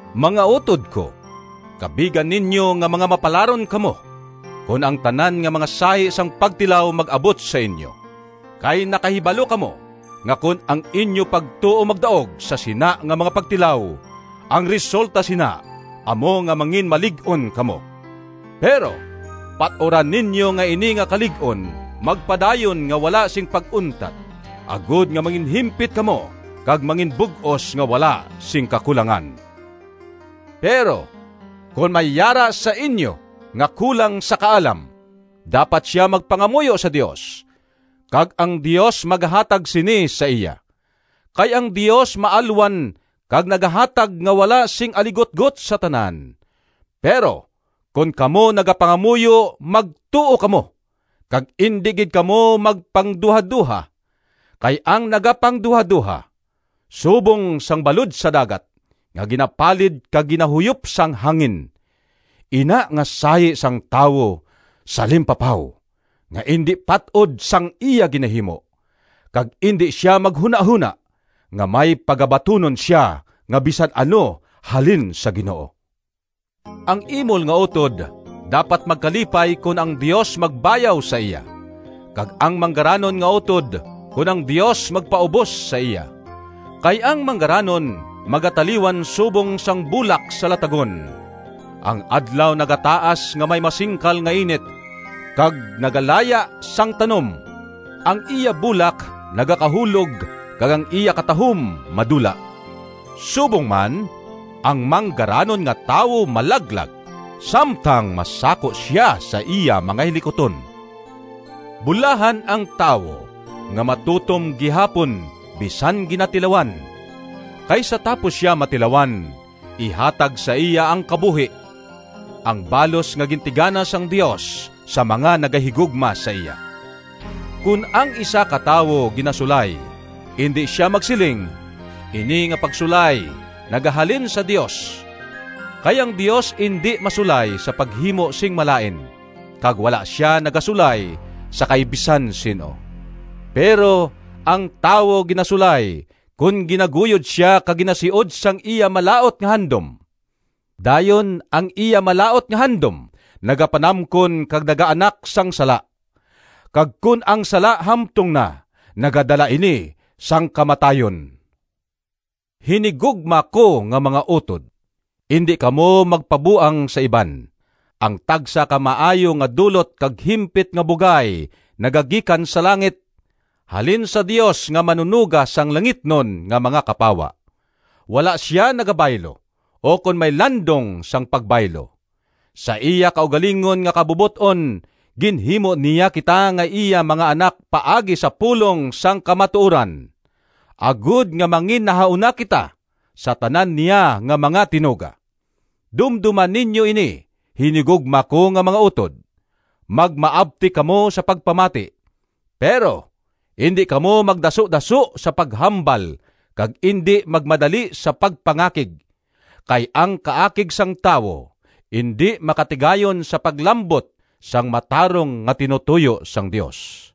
Mga utod ko! Kabiga ninyo nga mga mapalaron kamo kon ang tanan nga mga sahi sang pagtilaw mag-abot sa inyo, kay nakahibalo kamo nga kon ang inyo pagtuo magdaog sa sina nga mga pagtilaw, ang resulta sina amo nga manginmalig-on kamo. Pero pat-ura ninyo nga ini nga kalig-on magpadayon, nga wala sing pag-untat, agod nga manginhimpit kamo kag manginbug-os nga wala sing kakulangan. Pero kon may yara sa inyo nga kulang sa kaalam, dapat sia magpangamuyo sa Dios, kag ang Dios magahatag sini sa iya. Kay ang Dios maalwan kag nagahatag nga wala sing aligutgot sa tanan. Pero kon kamo nagapangamuyo magtuo kamo, kag indi gid kamo magpangduhadoha. Kay ang nagapangduhadoha subong sang balod sa dagat nga ginapalid kag ginahuyop sang hangin. Ina nga sahi sang tawo salimpapaw, nga indi pat-od sang iya ginahimo, kag indi sia maghunahona nga may pagabatunon sia nga bisan ano halin sa Ginoo. Ang imol nga utod dapat magkalipay kon ang Dios magbayaw sa iya, kag ang manggaranon nga utod kon ang Dios magpaubos sa iya. Kay ang manggaranon magataliwan subong sang bulak sa latagon. Ang adlaw nagataas nga may masingkal nga init, kag nagalaya sang tanom; ang iya bulak nagakahulog kag ang iya katahom madula. Subong man, ang manggaranon nga tawo malaglag samtang masako sia sa iya mga hilikuton. Bulahan ang tawo nga matutom gihapon bisan ginatilawan, kay sa tapos sia matilawan, ihatag sa iya ang kabuhi, ang balos nga gintigana sang Dios sa mga nagahigugma sa iya. Kon ang isa ka tawo ginasulay, indi sia magsiling, “Ini nga pagsulay nagahalin sa Dios.” Kay ang Dios indi masulay sa paghimo sing malain, kag wala sia nagasulay sa kay bisan sin-o. Pero ang tawo ginasulay kon ginaguyod sia kag ginasiod sang iya malaut nga handom. Dayon ang iya malaut nga handom nagapanamkon kag nagaanak sang sala. Kag kon ang sala hamtong na, nagadala ini sang kamatayon. Hinigugma ko nga mga utod, indi kamo magpabuang sa iban! Ang tagsa ka maayo nga dulot kag himpit nga bugay nagagikan sa langit, halin sa Dios, nga Manunoga sang langitnon nga mga kapawa. Wala sia nagabaylo, ukon may landong sang pagbaylo. Sa iya kaugalingon nga kabubot-on, ginhimo niya kita nga iya mga anak paagi sa pulong sang kamatuoran, agod nga manginnahauna kita sa tanan niya nga mga tinuga. Dumdoma ninyo ini, hinigugma ko nga mga utod! Magmaabtik kamo sa pagpamati, pero indi kamo magdasudaso sa paghambal kag indi magmadali sa pagpangakig. Kay ang kaakig sang tawo indi makatigayon sa paglambot sang matarong nga tinutoyo sang Dios.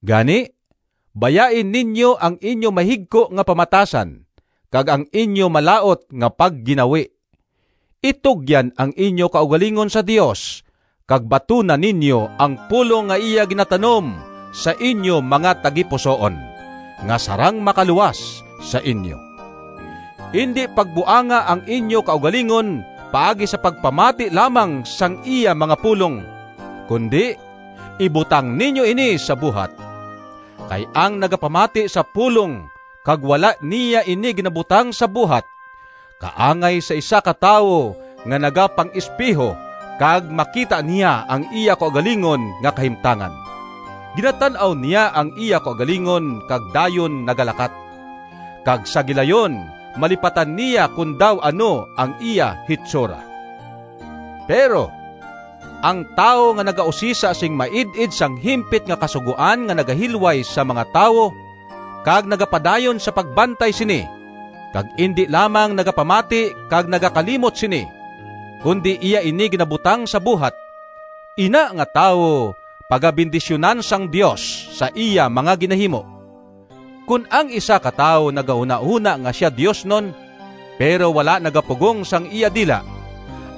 Gani, bayai ninyo ang inyo mahigko nga pamatasan kag ang inyo malaut nga pagginawi. Itugyan ang inyo kaugalingon sa Dios kag batuna ninyo ang pulong nga iya ginatanom sa inyo mga tagipusoon, nga sarang makaluwas sa inyo. Indi pagbuanga ang inyo kaugalingon paagi sa pagpamati lamang sang iya mga pulong, kundi ibutang ninyo ini sa buhat. Kay ang nagapamati sa pulong kag wala niya ini ginabutang sa buhat kaangay sa isa ka tawo nga nagapang-espeho kag makita niya ang iya kaugalingon nga kahimtangan. Ginatan-aw niya ang iya kaugalingon kag dayon nagalakat, kag sa gilayon malipatan niya kon daw ano ang iya hitsura. Pero ang tawo nga nagausisa sing maid-id sang himpit nga kasugoan nga nagahilway sa mga tawo, kag nagapadayon sa pagbantay sini, kag indi lamang nagapamati kag nagakalimot sini, kundi iya ini ginabutang sa buhat, ina nga tawo pagabendisyunan sang Dios sa iya mga ginahimo. Kon ang isa ka tawo nagahunahona nga sia diosnon, pero wala nagapugong sang iya dila,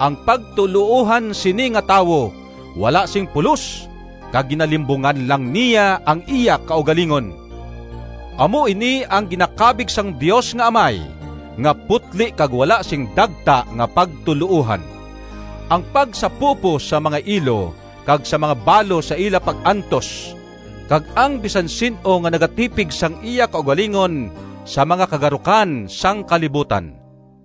ang pagtuloohan sini nga tawo wala sing pulos kag ginalimbungan lang niya ang iya kaugalingon. Amo ini ang ginakabig sang Dios nga Amay nga putli kag wala sing dagta nga pagtuloohan: ang pagsapupo sa mga ilo kag sa mga balo sa ila pag-antos, kag ang bisan sin-o nga nagatipig sang iya kaugalingon sa mga kagarukan sang kalibutan.